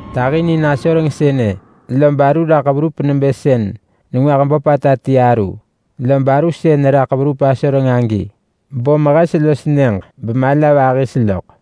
Tahinin asoreng sënë, lob aru raḳ verup nebë sën nengwah böpata ti aru. Lob aru sën raḳ verup asoreng agi bom hes los nyëġ bemala vahis loḳ.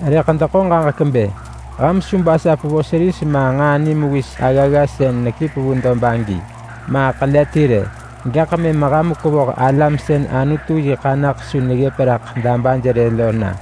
Rëḳ deḳo ġaġek bë su debasap vos ris ma nġaa nimewis aggagga sën nekip vu dob agi, ma ḳele ti rë. Gaḳ mëm dekevoh alam sën Anutu yi ḳanaḳ su neggëp raḳ dabaj rë lo na,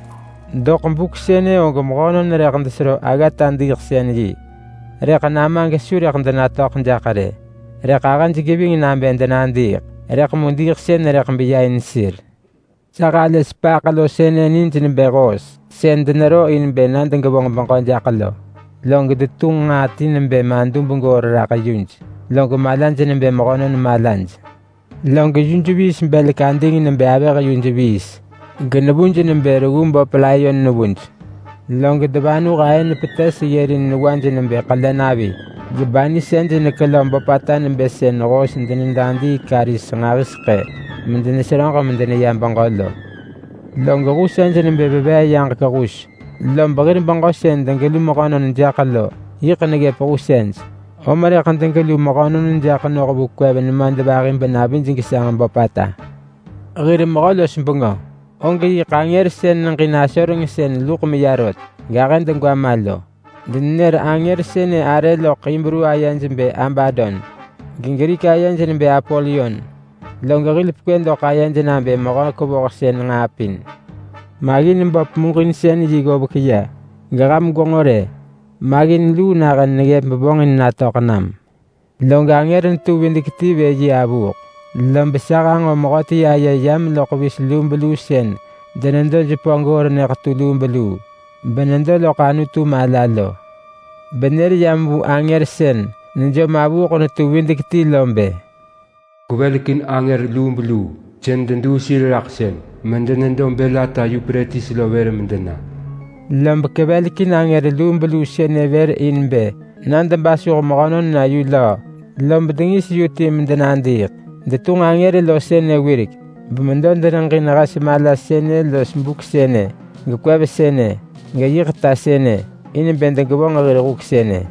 Doḳ buk sënë og mehönon rëḳ desero aggata diiḳsën yi, rëḳ nama gesu rëḳ denatöḳ jaḳ rë. Rëḳ ahëj geving nabë denadiiḳ, rëḳ mu diiḳsën rëḳ beya in sir. Sa halë sepaaḳ lo nij nebë hoos sën denero in bë na degevonġ beġö jaḳ lo. Log detunġ nġaa ti nebë madub goor raḳ yuj, log malaj nebë mehönon malaj. Log yuj belek ading nebë avëh yuj, genevuj nebë reggu böp layon nevuj. Log devanuh aën ahë petes ggërin newaj nebë ḳelenavi, gebanisej nekelö böpata nebë sën hoos denedadii karis nġahiseḳë medeneseröġ medeneya beġö lo. Log husej nebë veveeyaġek hus. Lob hir beġö sën degelu mehönon jaḳ lo neggëp husej, om rëḳ degelu mehönon jaḳ noh vu kwev nemadvahi benavij gesanġ böpata. Hir mehö-los-bengö og yiḳ angër sën neġin asoreng sën luḳ meya rot gahë degwa ma lo. Denenër angër sënë arë loḳ Hibru ayej bë Abadon, geGrik ayej nebë Apolyon. Log hil pekwë doḳ ayed nabë Mehö-kevohsën-nġaa-pin. Maggin böp muġinsën yi ggovek ya, geham gwenġo rë! Maggin luu nahën neggëp bevonġin natöḳ nam. Log angër netu videk-ti vë yi avuuḳ, lob sa hanġo mehöti aye yam loḳ vis lubeluu sën denedo jepö goor nyëḳetu lubeluu benedo loḳ Anutu mala lo. Benër yam vu angër sën nejom avuuḳ netu videk-ti lo bë, “Kwevelekin angër lubeluu sën deduu sir raḳ sëng medenedo bël ata Yupretis lo vër medena.” Lob kevelekin angër lubeluu sënë vër in bë na debasuh mehönon na yu löö, lob dengis yu ti medenadiiḳ. Detunġ angër lo sënë wirek, bemedo deneġin hes mala sënë los buk sënë, gekwev sënë, geyiḳ ta sënë, in bë degevonġ hir huk sënë.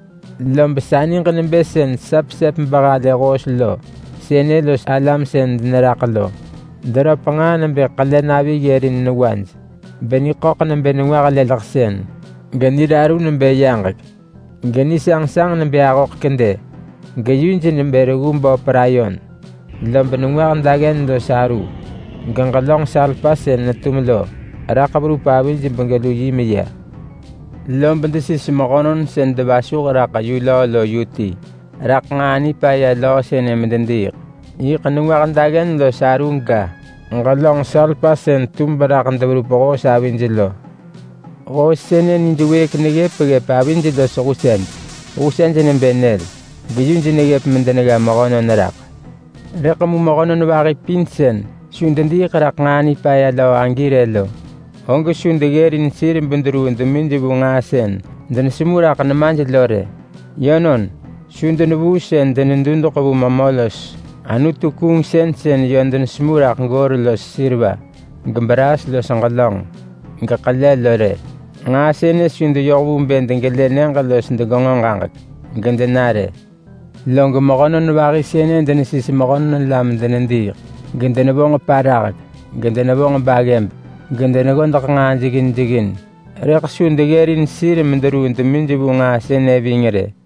Lob sa niġ nebë sën sa pesep behalë hoos lo sënë los alam sën deneraḳ lo. Deröp nġaa nebë ḳelenavi ggërin newaj, beniḳöḳ nebë nengwah leleḳsën, geniraru nebë yaġek, genisanġsanġ nebë ahoḳ kedë. Geyuj nebë reggu böp layon. Lob nengwah daggen los aru, geġelönġ salpa sën netum lo, raḳ verup avij begelu yi meya. Lob desis mehönon sën devasuh raḳ yu löö lo yu ti raḳ nġaa nipaya löö sënë medediiḳ. Yiḳ nengwah daggen los aru ga, ġelönġ salpa sën tum beraḳ deverup hoos avij lo. Hoos sënë nij wëëk neggëp ggëp avij los husej. Husej nebë nyël geyuj neggëp medenegga mehönon raḳ. Rëḳ mu mehönon vahi pin sën su dediiḳ raḳ nġaa nipaya löö agi rë lo, og su deggërin sir bederuu demij vu nġaa sën denesemu raḳ nemaj lo rë. Yönon, su denevuu sën denedudeḳ vu memö los anutu-kuungsën sën yö denesemu raḳ goor los seriva, gebraas los ġelönġ, geḳele lo rë. Nġaa sënë su deyoh vu bë degelë nyëġ los degenġo ġaġek, gedena rë. Log mehönon vahi sënë denesis mehö la medenediiḳ, gedenevonġ parahek, gedenevonġ baggëb, gedeneggodeḳ nġaa jeggin jeggin, rëḳ su deggërin sir mederuu demij vu nġaa sënë ving rë.